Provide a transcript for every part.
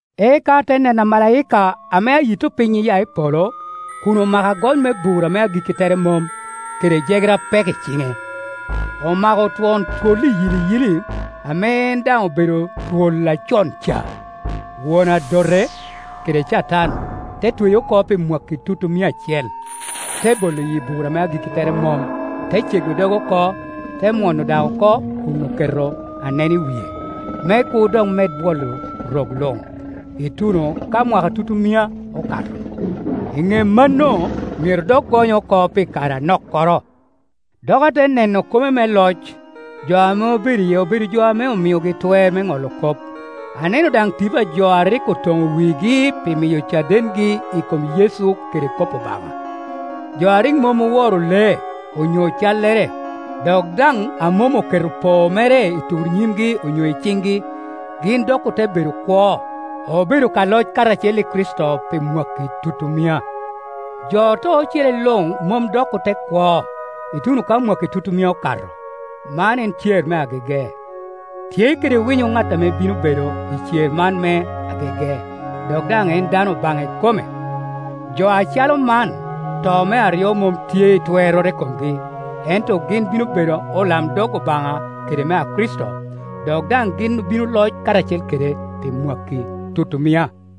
Eka ate neno amalaika ame ayitto piny iya i polo, kun omako agony me bur ame agikki tere mom, kede jegere apek i ciŋe. Omako twon twol iyiliyili, ame en daŋ obedo twol acon ca, Won Adote kede Catan, te tweye oko pi mwakki tutumia acel, te bolo iyi bur ame agikki tere mom, te cego doge oko, te mwono daŋ oko kun oketo anen i wie, me kur dok med bwolo rok luŋ, ituno ka mwakki tutumia okato. I ŋe mano, myero dok gonye oko pi kare anokkoro. Dok ate neno kome me loc; jo ame obedo iye obedo jo ame omiogi twer me ŋolo kop. Aneno daŋ tipo a jo a rik otono wigi pi miyo cadengi i kom Yecu kede kop Obaŋa, jo a rik mom oworo lee, onyo callere, dok daŋ a mom oketo poo mere i tur nyimgi onyo i ciŋgi. Gin dok ote bedo kwo, obedo ka loc karacel i Kricito pi mwakki tutumia. Jo oto ocele luŋ mom dok ote kwo, ituno ka mwakki tutumia okato. Man en cer me agege. Tye kede winyo ŋat ame bino bedo i cer man me agege, dok daŋ en dano Obaŋa ikome. Jo acalo man, to me aryo mom tye i twerroro i komgi, ento gin bino bedo olamdog Obaŋa kede mea Kricito, dok daŋ gin obino loc karacel kede pi mwakki tutumia.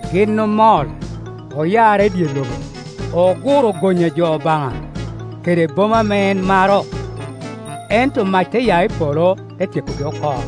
Gin omol, oyarre i dye lobo, oguro gony a jo Obaŋa, kede boma ame en maro; ento mac te ya i polo, te tyekogi oko.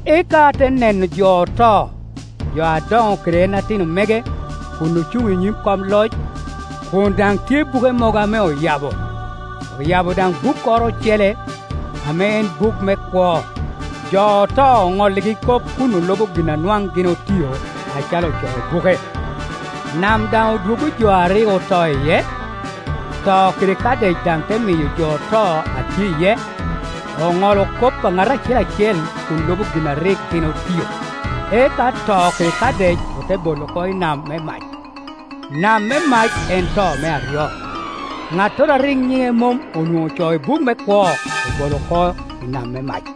Eka ate neno jo oto, jo adoŋo kede en ati no mege, kun ocuŋ i nyim kom loc, kun daŋ tye buke mogo ame oyabo. Oyabo daŋ bukkoro ocele, ame en buk me kwo. Jo oto onolligi kop kun olubo gin a nwaŋ gin otio, acalo ocoo i buke. Nam dan odwoggo jo a rik oto iye, To kede Kadec daŋ te miyo jo oto a tye iye; oŋolo kop a ŋat acel acel kun luba gin a rik gin otio. Eka To kede Kadec ote bolo oko i nam me mac. Nam me mac en to me aryo. Ŋattoro a rik nyine mom onwoŋo ocoo i buk me kwo obolo oko i nam me mac.